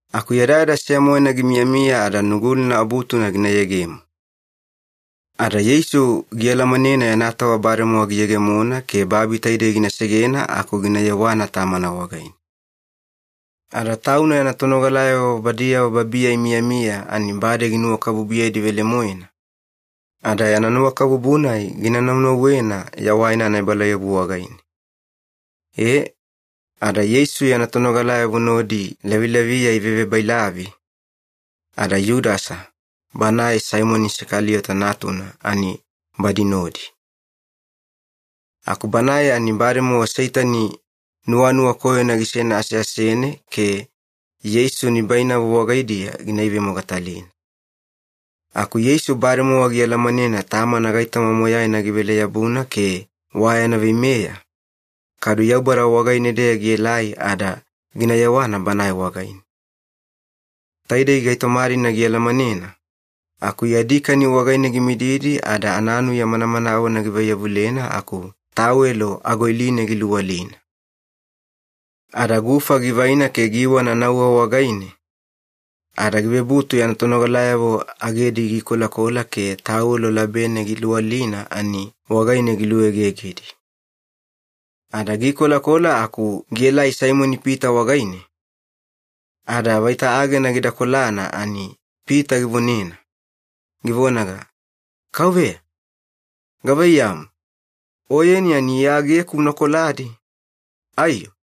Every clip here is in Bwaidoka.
Aku yadayada seya-moena gimiyamiya ada Nugulina Abutuna gina yegemo. Ada Yeisu gialamanena yana tova bademowa giyegemona ke babi taidei gina segena aku gina yewana Tamana wagaine. Ada Tauna yana tonogalayavo badiyavo babiya imiyamiya ani bade ginuwakabubuyedi velemoena, ada yana nuwakabubu-nai gina naunauwena yawaina anaebalauyabu wagaine. E, ada Yeisu yana tonogalayavo nodi lavilaviya ivevebailavi, ada Yudasa, banae Saimoni Isakaliyota natuna ani badi nodi. Aku banae ani bademowa Seitani nuwanuwa koyona gisena aseasene ke Yeisu nibainavo wagaidiya gina ivemogatalina. Aku Yeisu bademowa gialamanena Tamana gaitoma moyaina givele-yabuna ke wa yana veimeya, kadu Yaubada wagaine-deya gielai ada gina yewana Banae wagaine. Taidei gaitoma-dina gialamanena, aku yadi kani wagaine gimididi ada ananuya manamanawena givaiyavulena aku tawelo agoiline giluwalina. Ada gufa givaina ke giiwana nauwa wagaine, ada givebutu yana tonogalayavo agedi giikolakola ke tawelo labene giluwalina ani wagaine giluegegedi. Ada giikolakola aku gielai Saimoni-Pita wagaine, ada vaita agena gida kolana ani Pita givonena, givonaga, “Kauveya, gavaiyamu, Oyeni ani Iya ageku una koladi, aiyo?”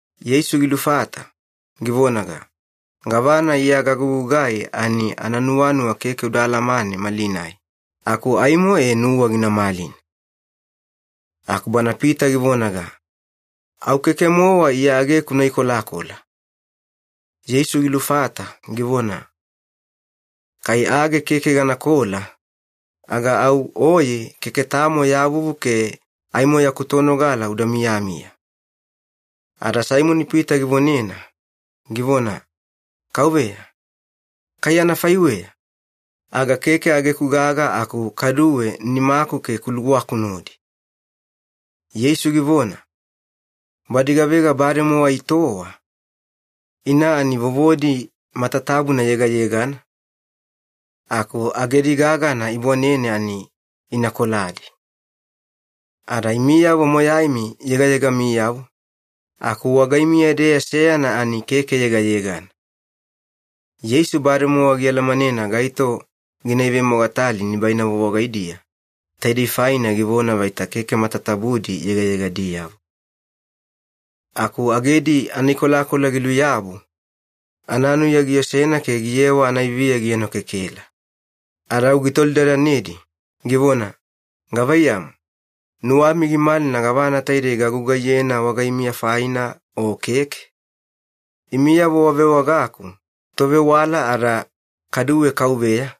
Yeisu gilufata, givonaga, “Gavana Iya gagugugai ani ananuwanuwa keke uda alamane malinai, aku aimo e nuwa gina malina.” Aku bana Pita givonaga, “Au keke-mowa Iya ageku una ikolakola.” Yeisu gilufata givona, “Kai age keke ganakola, aga au oye keke tamo ya vuvu ke aimo yaku tonogala uda miyamiya.” Ada Saimoni-Pita givonena, givona, “Kauveya, kai anafaiweya, aga keke ageku gaga aku kaduwe nimaku ke kuluwaku nodi.” Yeisu givona, “Badi gavega bademowa itowa, ina ani vovodi matatabuna yegayegana, aku agedi gagana ibwanene ani ina koladi. Ada imiyavo moyaimi yegayegamiyavo, aku wagaimiya-deya seyana ani keke yegayegana.” Yeisu bademowa gialamanena gaito gina ivemogatali nibainavo wagaidiya, taidei faina givona vaita keke matatabudi yegayegadiyavo. Aku agedi anaikolakola giluyabu, ananuya giosena ke giyewa anaiviya gienokekela. Ada au gitolidadanedi, givona, “Gavaiyamu, nuwami gimalina gavana taidei gagugaiyena wagaimiya faina, o keke? Imiyavo wavewagaku, ‘Tovewala’ ada kaduwe ‘Kauveya’,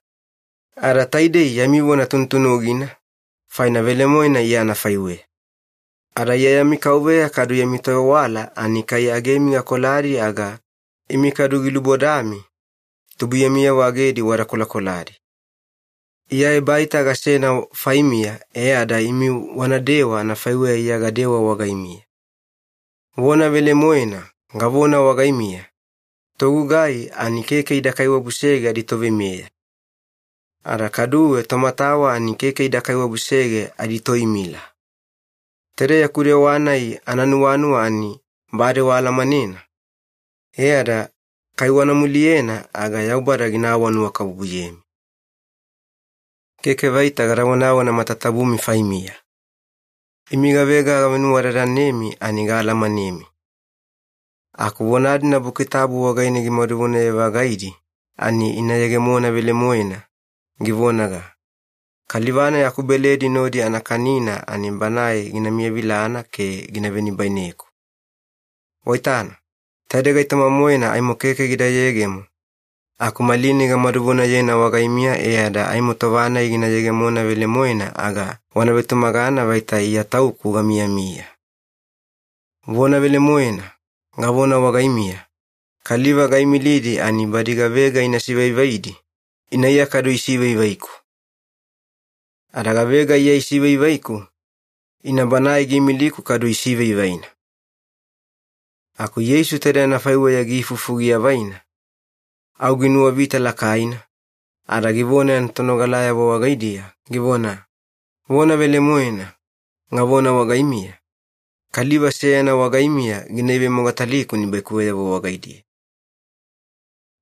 ada taidei yami vona tunutunugina, faina velemoena Iya anafaiweya. Ada Iya yami Kauveya kadu yami Tovewala ani kai agemi gakoladi aga imi kadu gilubodami tubuiyamiyavo agedi wada kolakoladi. Iya ebaita gasena faimiya e ada imi wanadewa anafaiweya Iya gadewa wagaimiya. Vona velemoena, gavona wagaimiya, togugai ani keke ida kaiwabusege aditoveimeya. Ada kaduwe tomatawa ani keke ida kaiwabusege aditoimila. Taide yaku dewa-nai ananuwanuwa ani bade waalamanena, e ada kai wana muliyena aga Yaubada gina awanuwakabubuyemi. “Keke vaita gada vonavona matatabumi faimiya. Imi gavega gavenuwadadanemi ani gaalamanemi. Aku vona-dina Buki Tabu wagaine gimadu vonaye-vagaidi ani ina yegemona velemoena, givonaga, ‘Kaliva-nai akubeledi nodi ana kanina ani banae gina miyavilana ke gina venibaineku.’ Waitana, taidei gaitoma-moena aimo keke gida yegemo, aku malinai gamaduvonayena wagaimiya e ada aimo tova-nai gina yegemona velemoena aga wana vetumagana vaita IYA TAUKU GAMIYAMIYA. Vona velemoena, gavona wagaimiya, kaliva gaimilidi ani badi gavega ina sivaivaidi, ina Iya kadu isivaivaiku. Ada gavega Iya isivaivaiku, ina Banae giimiliku kadu isivaivaina.” Aku Yeisu taide anafaiweya giifufu giavaina, au ginuwavita lakaina, ada givona yana tonogalayavo wagaidiya, givona, “Vona velemoena, gavona wagaimiya, kaliva seyana wagaimiya gina ivemogataliku nibaikuweyavo wagaidiya.”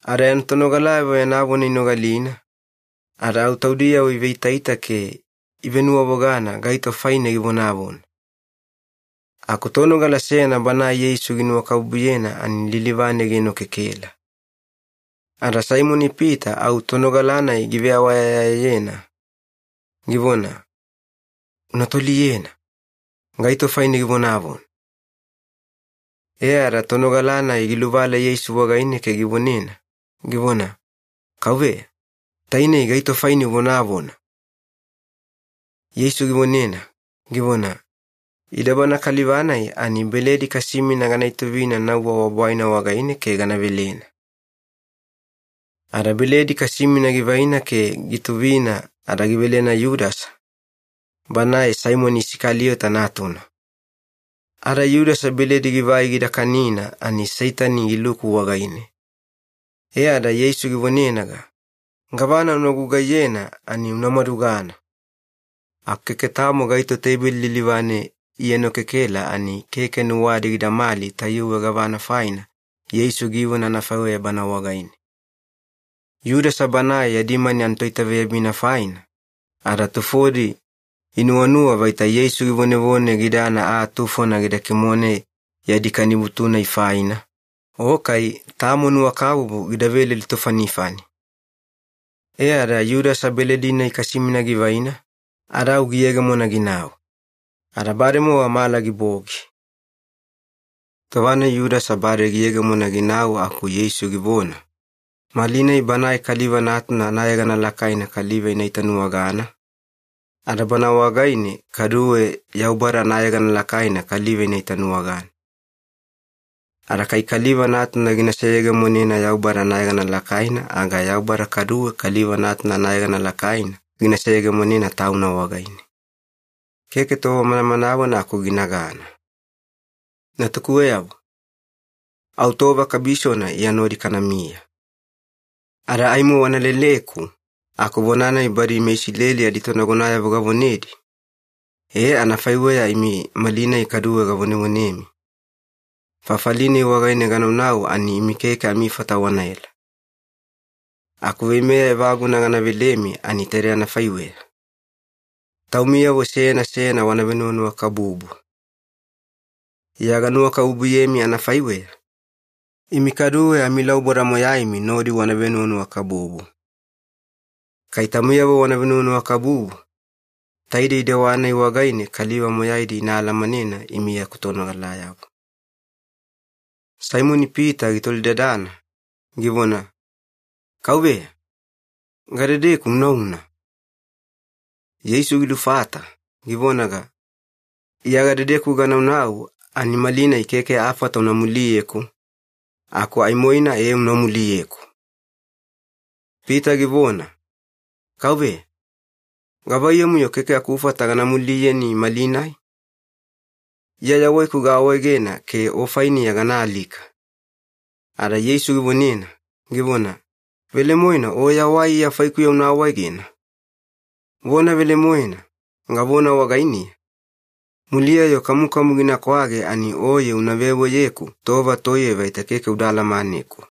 Ada yana tonogalayavo yana vona inogalina, ada au taudiyavo iveitaita ke ivenuwavogana gaito faine givonavona. Aku tonogala seyana banae Yeisu ginuwakabubuyena ani lilivane gienokekela. Ada Saimoni-Pita au tonogala-nai giveawayayayena, givona, “Una toliyena, gaito faine givonavona?” E ada tonogala-nai giluvala Yeisu wagaine ke givonena, givona, “Kauveya, tainei gaito faine uvonavona?” Yeisu givonena, givona, “Ida bana kaliva-nai ani beledi kasimina gana ituvina nauwa wa bwaina wagaine ke gana velena.” Ada beledi kasimina givaina ke giituvina ada givelena Yudasa, banae Saimoni Isakaliyota natuna. Ada Yudasa beledi givai gida kanina ani Seitani giluku wagaine. E ada Yeisu givonenaga, “Gavana una gugaiyena ani una madugana.” Aku keke tamo gaito teibeli lilivane ienokekela ani keke nuwadi gidamali tayuwe gavana faina Yeisu givona anafaiweya bana wagaine. Yudasa banae yadi mani anatoitaveyabina faina, ada tufodi inuwanuwa vaita Yeisu givonevone gidana aa tufona gida kimone yadi kanibutu-nai faina, o kai tamo nuwakabubu gida veledi tofanifani. E ada Yudasa beledi-nai kasimina givaina, ada au giyegemona ginau. Ada bademowa mala gibogi. Tova-nai Yudasa bade giyegemona ginau aku Yeisu givona, “Malinai Banae Kaliva Natuna anayegana lakaina kaliva ina itanuwagana, ada Bana wagaine kaduwe Yaubada anayegana lakaina kaliva ina itanuwagana. Ada kai Kaliva Natuna gina seyegemonena Yaubada anayegana lakaina aga Yaubada kaduwe Kaliva Natuna anayegana lakaina gina seyegemonena Tauna wagaine. Keke tova manamanawena aku ginagana. “Natukuweyavo, au tova kabisona Iya nodi kanamiya. Ada aimo wana leleku, aku vona-nai badi meIsileli aditonagonayavo gavonedi, e anafaiweya imi malinai kaduwe gavonevonemi, ‘Fafali-nai wagaine ganaunau ani imi keke amifata wanaela.’ Aku veimeya evaguna gana velemi ani taide anafaiweya. Taumiyavo seyana seyana wana venuwanuwakabubu. Iya ganuwakabubuyemi anafaiweya, imi kaduwe amilauboda moyaimi nodi wana venuwanuwakabubu. Kai taumiyavo wana venuwanuwakabubu, taidei dewa-nai wagaine kaliva moyaidi ina alamanena imi yaku tonogalayavo.” Saimoni-Pita gitolidadana, givona, “Kauveya, gadedeku unauna?” Yeisu gilufata, givonaga, “Iya gadedeku ganaunau ani malinai keke afata una muliyeku, aku aimoina ee una muliyeku.” Pita givona, “Kauveya, gavaiyamu-yo keke akufata gana muliyeni malinai? Iya yawaiku gaawaegena ke O fainiya gana alika.” Ada Yeisu givonena, givona, “Velemoena o yawai Iya faikuya una awaegena? Vona velemoena, gavona wagainiya, muliya-yo kamukamu gina kwage ani oye una veweyeku tova toiye vaita keke uda alamaneku.”